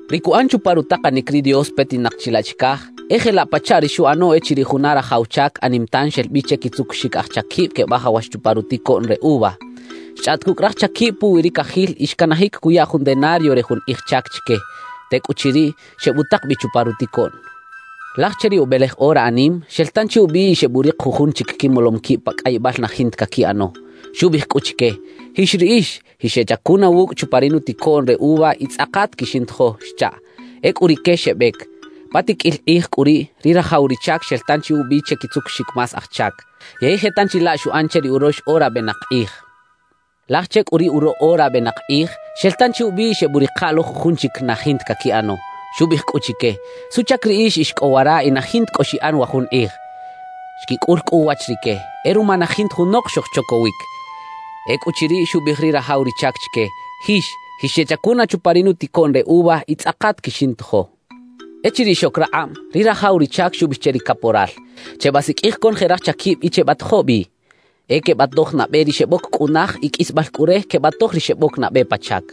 »Ri cuꞌan chupa rutakanic ri Dios petinak chilaꞌ chicaj e jelaꞌ pachaꞌ ri xuꞌano echiriꞌ juna rajaw chac anim tan xel bi che quitzucuxic aj chaquib quebajawax chupa ruticoꞌn re uva. Xchꞌaꞌt cucꞌ raj chaquib puwi ri cajil y xcanajic cuya jun denario re jun kꞌij chac chique. Tecꞌuchiriꞌ, xebutak bi chupa ruticoꞌn. Laj che ri ubelej ora anim, xel tanchi ubi y xeburik jujun chic quimolom quib pa cꞌayibal na jinta caquiꞌano. »Xubiꞌij cꞌu chique: “Jix riꞌix, jixeꞌchacuna wucꞌ chupa ri nuticoꞌn re uva y tzꞌakat quixintojo” xchaꞌ. Ecꞌu rique xebec. »Pa tiqꞌuil kꞌij cꞌu riꞌ, ri rajaw ri chac xel tanchi ubi che quitzukuxic más aj chac. Yey je tanchi laꞌ xuꞌan che ri urox ora benak kꞌij. »Laj che cꞌu ri uroꞌ ora benak kꞌij, xel tanchi ubi y xebuꞌrika lo jujun chic na jinta caquiꞌano. Xubiꞌij cꞌu chique: “¿Suꞌchac riꞌix ix cꞌo wara y na jinta cꞌo xiꞌan wa jun kꞌij?” »Xquicꞌul cꞌu uwach rique: “E ruma na jinta junok xojchocowic.” »Ecꞌuchiriꞌ, xubiꞌij ri rajaw ri chac chique: “Jix, jixeꞌchacuna chupa ri nuticoꞌn re uva y tzꞌakat quixintojo.” »Echiriꞌ xoc rakꞌab, ri rajaw ri chac xubiꞌij che ri caporal: “Chebasiqꞌuij conoje raj chaquib y chebatojo bi. E quebatoj nabe ri xeboc cꞌunaj, y qꞌuisbal cꞌu re, quebatoj ri xeboc nabe pa chac.”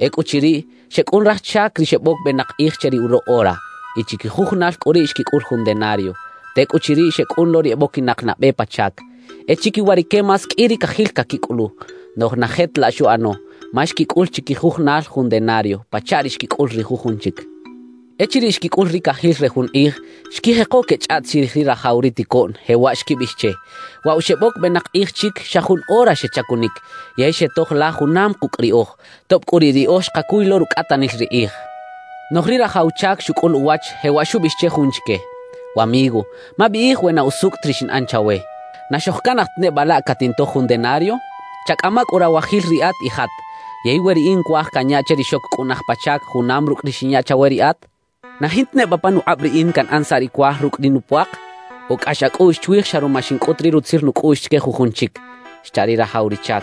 »Ecꞌuchiriꞌ, xecꞌun raj chac ri xeboc benak kꞌij che ri uroꞌ ora. Y chiquijujunal cꞌu riꞌ xquicꞌul jun denario. Tecꞌuchiriꞌ, xecꞌun lo ri eboquinak nabe pa chac. E chiquiwa rique más qꞌui ri cajil caquicꞌulu. Noꞌj na je ta laꞌ xuꞌano, ma xquicꞌul chiquijujunal jun denario, pachaꞌ ri xquicꞌul ri jujun chic. »Echiriꞌ xquicꞌul ri cajil re jun kꞌij, xquijeko quechꞌaꞌt chirij ri rajaw ri ticoꞌn, jewaꞌ xquibiꞌij che: “Waꞌ wa xeboc benak kꞌij chic, xa jun ora xechacunic yey xetoj la junam kucꞌ riꞌoj, tob cꞌu riꞌ riꞌoj xkacuy lo rucꞌatanil ri kꞌij” xechaꞌ. »Noꞌj ri rajaw chac xucꞌul uwach, jewaꞌ xubiꞌij che jun chique: “Wamigo, mabiꞌij we na usucꞌ ta ri xinꞌan chawe. ¿Na xojcanaj ta neba laꞌ catintoj jun denario? Chacꞌama cꞌu rawajil riꞌat y jat. Yey we riꞌin cuaj canya che ri xoc cꞌunaj pa chac, junam rucꞌ ri xinya chawe riꞌat, ¿na jinta neba panukꞌab riꞌin canꞌan saꞌ ri cuaj rucꞌ ri nupuak? ¿O cꞌax acꞌuꞌx chwij xa ruma xincꞌut ri rutzil nucꞌuꞌx chique jujun chic?” xcha ri rajaw ri chac.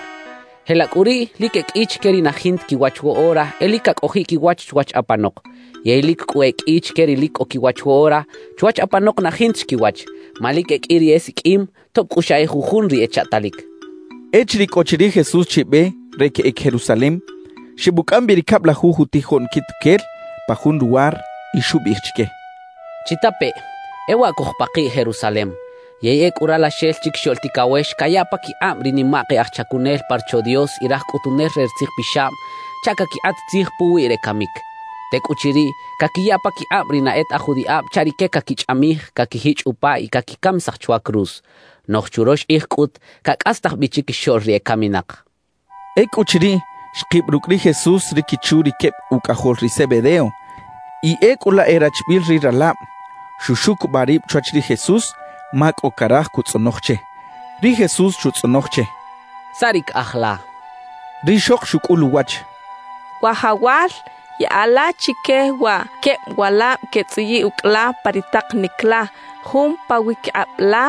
»Jelaꞌ cꞌu riꞌ, lic e qꞌui chique ri na jinta quiwach woꞌora, e lic cacꞌojiꞌ quiwach chwach apanok; yey lic cꞌu e qꞌui chique ri lic cꞌo quiwach woꞌora, chwach apanok na jinta chi quiwach. Ma lic e qꞌui ri esiqꞌuim, tob cꞌu xa e jujun ri echaꞌtalic —xcha ri Jesús. Echiriꞌ cꞌo chi ri Jesús chi be re queꞌec Jerusalem, xebucꞌam bi ri cablajuj utijoꞌn quituquel pa jun luwar y xubiꞌij chique: «Chitapeꞌ: E waꞌ cojpakiꞌ Jerusalem, yey ecꞌu Ralaxel Chiquixoꞌl Ticawex cayaꞌ paquikꞌab ri nimak e aj chacunel pa Rocho Dios y raj cꞌutunel re ri tzijpixab chaꞌ caquikꞌat tzij puwiꞌ re camic. Tecꞌuchiriꞌ, caquiya paquikꞌab ri na e ta aj judiꞌab chaꞌ rique caquichꞌamij, caquijichꞌ upa y caquicamisaj chwa cruz. Noꞌj churox kꞌij cꞌut cacꞌastaj bi chiquixoꞌl ri ecaminak» xchaꞌ. Ecꞌuchiriꞌ, xkib rucꞌ ri Jesús ri quichu ri queb ucꞌajol ri Zebedeo, y ecꞌu laꞌ e rachbiꞌil ri ralab; xuxucubaꞌ rib chwach ri Jesús ma cꞌo caraj cutzꞌonoj che. Ri Jesús xutzꞌonoj che: —¿Saꞌ ri caꞌaj la? —xchaꞌ. Rixok xucꞌul uwach: —Wajawal, yaꞌa la chique wa queb walab quetzꞌuyiꞌ ucꞌ la pa ri takanic la, jun pawiquikꞌab la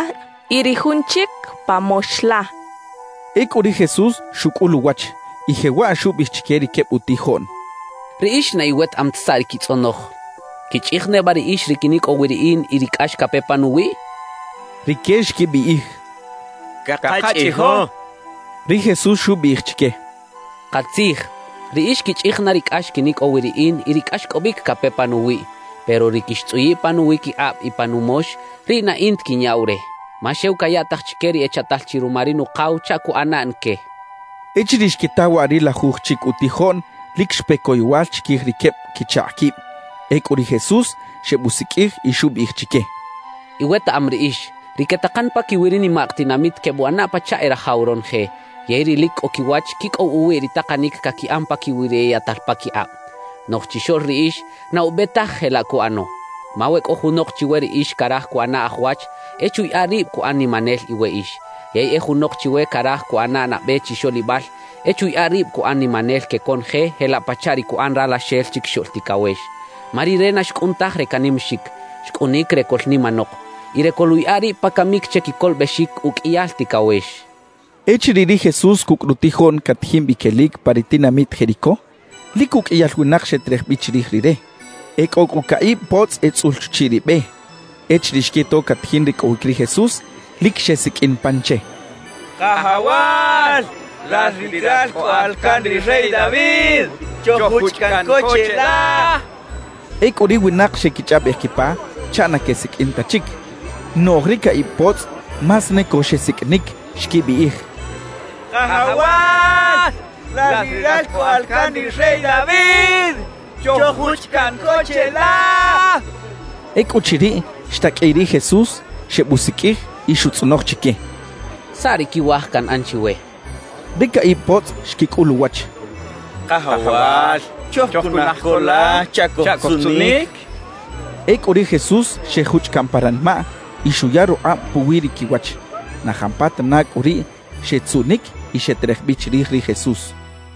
y ri jun chic, pa mox la —xchaꞌ. Ecꞌu ri Jesús xucꞌul uwach, y jewaꞌ xubiꞌij chique ri queb utijoꞌn: —Riꞌix na iwetaꞌam taj saꞌ ri quitzꞌonoj. ¿Quichꞌij neba riꞌix ri quinicꞌow wi riꞌin y ri cꞌax cape panuwiꞌ? —xchaꞌ. Rique xquibiꞌij: —Cakachꞌijo —xechaꞌ. Ri Jesús xubiꞌij chique: —Katzij, riꞌix quichꞌij na ri cꞌax quinicꞌow wi riꞌin y ri cꞌaxcꞌobic cape panuwiꞌ. Pero ri quixtzꞌuyiꞌ pa nuwiquikꞌab y pa numox, riꞌ na in ta quinyaꞌw re. Ma xew cayaꞌtaj chique ri echaꞌtal chi ruma ri Nukaw chaꞌ cuꞌana na que —xchaꞌ. Echiriꞌ xquita waꞌ ri lajuj chic utijoꞌn, lic xpe coyowal chiquij ri queb quichakꞌ quib. Ecꞌu ri Jesús xebusiqꞌuij y xubiꞌij chique: —Iwetaꞌam riꞌix, ri quetakan paquiwi ri nimak tinamit quebuꞌana pachaꞌ e rajaw ronoje; yey ri lic cꞌo quiwach quicꞌow uwiꞌ ri takanic caquiꞌan paquiwi ri eyaꞌtal paquikꞌab. Noꞌj chixoꞌl riꞌix na ube taj jelaꞌ cuꞌano. Ma we cꞌo junok chiwe riꞌix caraj cuꞌana aj wach, e chuyaꞌa rib cuꞌan nimanel iweꞌix. Yey e junok chiwe caraj cuꞌana nabe chixoꞌlibal, e chuyaꞌa rib cuꞌan nimanel que conoje jelaꞌ pachaꞌ ri cuꞌan Ralaxel Chiquixoꞌl Ticawex. Ma Rire na xcꞌun taj re canimaxic; xcꞌunic re coꞌlnimanok y re coluꞌyaꞌa rib pa camic che quicolobexic uqꞌuiyal ticawex —xchaꞌ. Echiriꞌ ri Jesús cucꞌ rutijoꞌn catajin bi quelic pa ri tinamit Jericó, lic uqꞌuiyal winak xeterej bi chirij Rire. E cꞌo cꞌu caꞌib potzꞌ etzꞌul chuchiꞌ ri be. Echiriꞌ xquito catajin ricꞌowic ri Jesús, lic xesiqꞌuin pan che: —¡Kajawal, lal ri Ralcꞌoꞌal can ri rey David, choj-juchꞌ caꞌn co cheꞌla! —xechaꞌ. Ecꞌu ri winak xequichꞌaꞌbej quipa chaꞌ na quesiqꞌuin ta chic, noꞌj ri caꞌib potzꞌ más ne co xesiqꞌuinic, xquibiꞌij: —¡Kajawal, lal ri Ralcꞌoꞌal can ri rey David, choj-juchꞌ caꞌn co cheꞌla! —xechaꞌ. Ecꞌuchiriꞌ, xtaqꞌuiꞌ ri Jesús, xebusiqꞌuij y xutzꞌonoj chique: —¿Saꞌ ri quiwaj canꞌan chiwe? —xchaꞌ. Ri caꞌib potzꞌ xquicꞌul uwach: —Kajawal, chojcunaj co la chaꞌ cojtzuꞌnic —xechaꞌ. Ecꞌu ri Jesús xejuchꞌ caꞌn pa ranimaꞌ y xuya rukꞌab puwi ri quiwach. Na jampatana cꞌu riꞌ xetzuꞌnic y xeterej bi chirij ri Jesús.